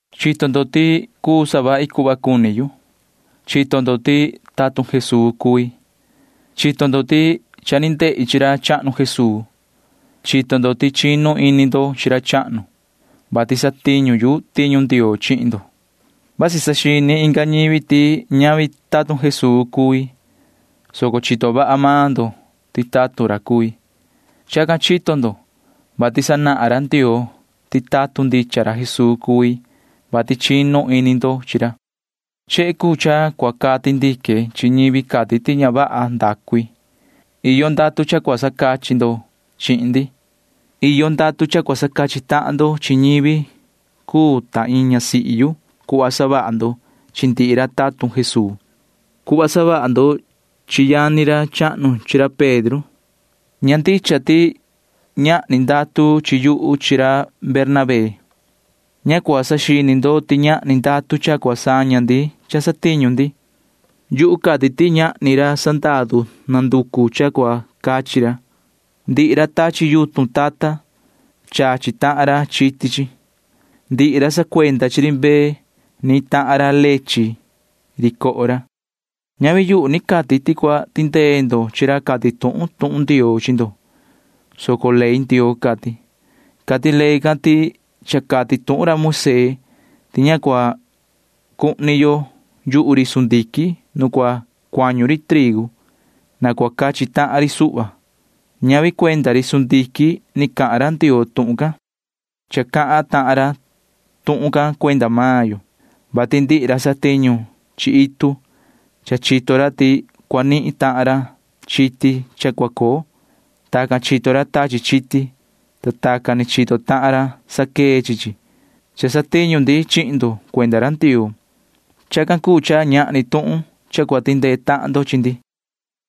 Chito ndo ti cuu savahi cuhva cuni yu. Chito ndo ti tatun Jesuu cui. Chito ndo ti cha ni ndehi chi ra chahnu Jesuu. Chito ndo ti chinu ini ndo chi ra chahnu, vati satiñu yu tiñu Ndioo chihin ndo. Vasi saxini inga ñivi ti ñavi tatun Jesuu cui, soco chito vaha maan ndo ti tatun ra cui. Chacan chito ndo, vati sanahan ra Ndioo ti tatun ndicha ra Jesuu cui, vati chinu ini ndo chi ra. Chehe cuu cha cua cati ndique chi ñivi cati ti ña vaha ndacu i. Iyo ndatu cha cua sacachi ndo chihin ndi. Iyo ndatu cha cua sacachi tahan ndo chi ñivi cuu ta iin ñasihi yu cuhva savaha ndo chi ndihi ra tatun Jesuu, cuhva savaha ndo chi yani ra chahnu chi ra Pedro. Ña ndicha ti cha ñahni ndatu chi yuhu chi ra Bernabé. Ña cua saxini ndo ti ñahni ndatu cha cua saña ndi cha satiñu ndi. Yuhu cati ti ñahni ra sandaru nanducu cha cua cachi ra. Ndihi ra tachi yutun tata―chachi tahan ra chiti chi. Ndihi ra sacuenda chi ri mbee―nihin tahan ra leche ri coho ra. Ñavi yuhu ni cati ti cua tindee ndo chi ra cati tuhun tuhun Ndioo chi ndo, soco ley Ndioo cati. Cati ley can ti cha cati tuhun ra Moisee ti ña cua cuhni yo yuhu ri sundiquin nu cua cuañu ri trigu. Na cua cachi tahan ri suhva. Ñavi cuenda ri sundiquin ni cahan ra Ndioo tuhun can. Cha cahan tahan ra tuhun can cuenda maan yo, vati ndihi ra satiñu chi itu―cha chito ra ti cua nihin tahan ra chiti cha cua coo. Tacan chito ra tachi chiti, ta tacan ni chito tahan ra saquee chi chi. Cha satiñu ndi chihin ndo cuenda ra Ndioo. Chacan cuu cha ñahni tuhun cha cua tindee tahan ndo chi ndi.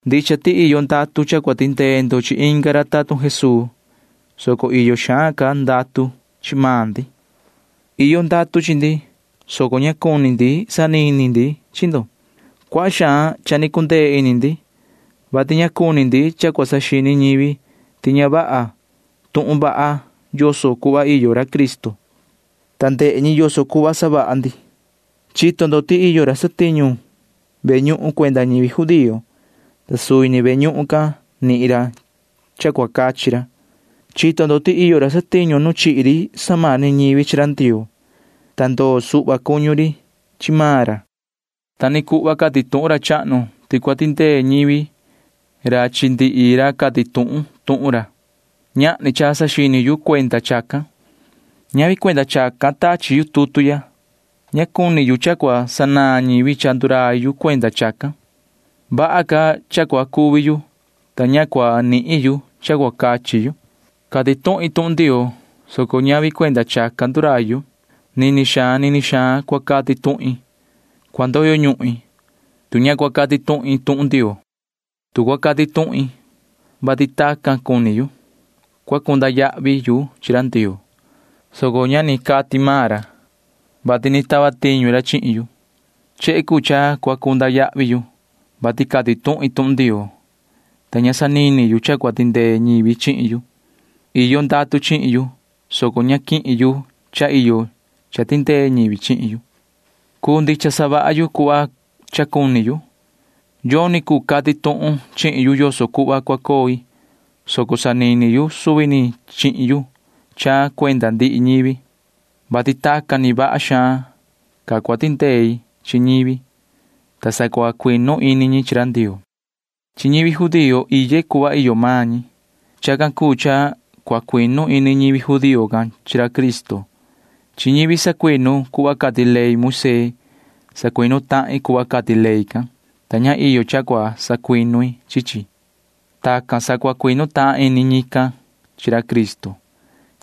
Ndicha ti iyo ndatu cha cua tindee ndo chi inga ra tatun Jesuu, soco iyo xaan ca ndatu chi maan ndi. Iyo ndatu chi ndi, soco ña cuni ndi sanini ndi chi ndo. Cuaha xaan cha ni cundee ini ndi, vati ña cuni ndi cha cua saxini ñivi ti ña vaha tuhun vaha yoso cuhva iyo ra Cristo, ta ndehe ñi yoso cuhva savaha ndi. Chito ndo ti iyo ra satiñu ve ñuhun cuenda ñivi judío, ta suvi ni ve ñuhun can nihin ra cha cua cachi ra. Chito ndo ti iyo ra satiñu nu chihi ri samani ñivi chi ra Ndioo, ta ndoo suhva cuñu ri chi maan ra. Ta ni cuhva cati tuhun ra chahnu ti cua tindee ñivi ra chi ndihi ra cati tuhun tuhun ra. Ñahni cha saxini yu cuenda chacan. Ñavi cuenda chacan tachi yu tutu ya. Ña cuni yu cha cua sanaan ñivi cha ndurai yu cuenda chacan. Vaha ca cha cua cuvi yu, ta ña cua nihin yu cha cua cachi yu. Cati tuhin tuhun Ndioo, soco ñavi cuenda chacan ndurai yu. Nini xaan nini xaan cua cati tuhin. Cua ndoyo ñuhin, tu ña cua cati tuhin tuhun Ndioo. Tu cua cati tuhin, vati tacan cuni yu, cua cunda yahvi yu chi ra Ndioo, soco cha ni cati maan ra, vati ni tava tiñu ra chihin yu. Chehe cuu cha cua cunda yahvi yu, vati cati tuhin tuhun Ndioo, ta ña sanini yu cha cua tindee ñivi chihin yu. Iyo ndatu chihin yu, soco ña quihin yu cha iyo cha tindee ñivi chihin yu. Cuu ndicha savaha yu cuhva cha cuni yu. Yoni cuu cati tuhun chihin yu yoso cuhva cua coi, soco sanini yu suvi ni chihin yu cha cuenda ndihi ñivi, vati tacan ni vaha xaan ca cua tindei chi ñivi, ta sa cua cuinu ini ñi chi ra Ndioo. Chi ñivi judío iye cuhva iyo maan ñi. Chacan cuu cha cua cuinu ini ñivi judío can chi ra Cristo. Chi ñivi sacuinu cuhva cati ley Moisee sacuinu tahin cuhva cati ley can, ta ña iyo cha cua sacuinu i chi chi. Tacan sa cua cuinu tahan ini ñican chi ra Cristo.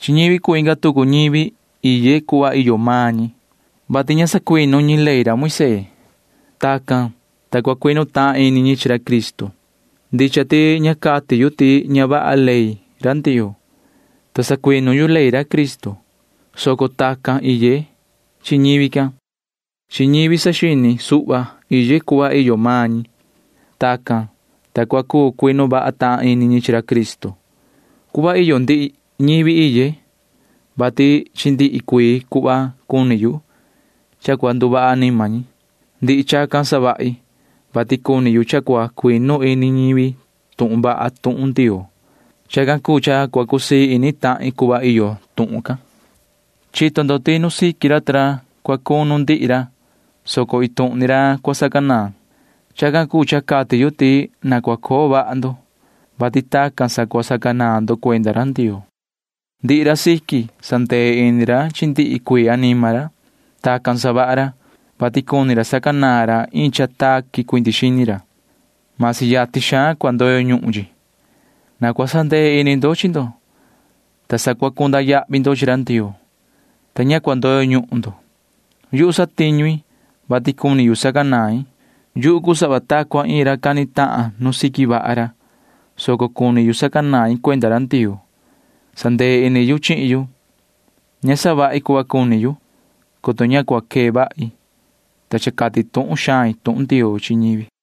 Chi ñivi cuu inga tucu ñivi iye cuhva iyo maan ñi, vati ña sacuinu ñi ley Moisee. Tacan, ta cua cuinu tahan ini ñi chi ra Cristo. Ndicha ti ña cati yu ti ña vaha ley ra Ndioo, ta sacuinu yu ley Cristo, soco tacan iye chi ñivi can. Chi ñivi saxini suhva iye cuhva iyo maan ñi. Tacan, ta cua cuu cuinu vaha tahan ini ñi chi ra Cristo. Cuhva iyo ndihi ñivi iye, vati chi ndihi cuii cuhva cuni yu cha cua nduvaha anima ñi. Ndihi chacan savahi, vati cuni yu cha cua cuinu ini ñivi tuhun vaha tuhun Ndioo. Chacan cuu cha cua cusii ini tahin cuhva iyo tuhun can. Chito ndo ti nu siqui ra ta ra cua cunu ndihi ra, soco iin tuhun ni ra cua sacanaan. Chacan cuu cha cati yu ti na cua coo vaha ndo, vati tacan sa cua sacanaan ndo cuenda ra Ndioo. Ndihi ra siqui sandee ini ra chi ndihi cuii anima ra. Tacan savaha ra, vati cuni ra sacanaan ra iin cha taqui cuindi xini ra―masi yatin xaan cua ndoyo ñuhun chi. Na cua sandee ini ndo chi ndo, ta sa cua cunda yahvi ndo chi ra Ndioo, ta ña cua ndoyo ñuhun ndo. Yuhu satiñu i, vati cuni yu sacanain. Yuhu cuu sava ta cua iin ra cani tahan nu siqui vaha ra, soco cuni yu sacanain cuenda ra Ndioo. Sandee ini yu chihin yu. Ña savahi cuhva cuni yu, coto ña cua quee vahi, ta cha cati tuhun xain tuhun Ndioo chi ñivi.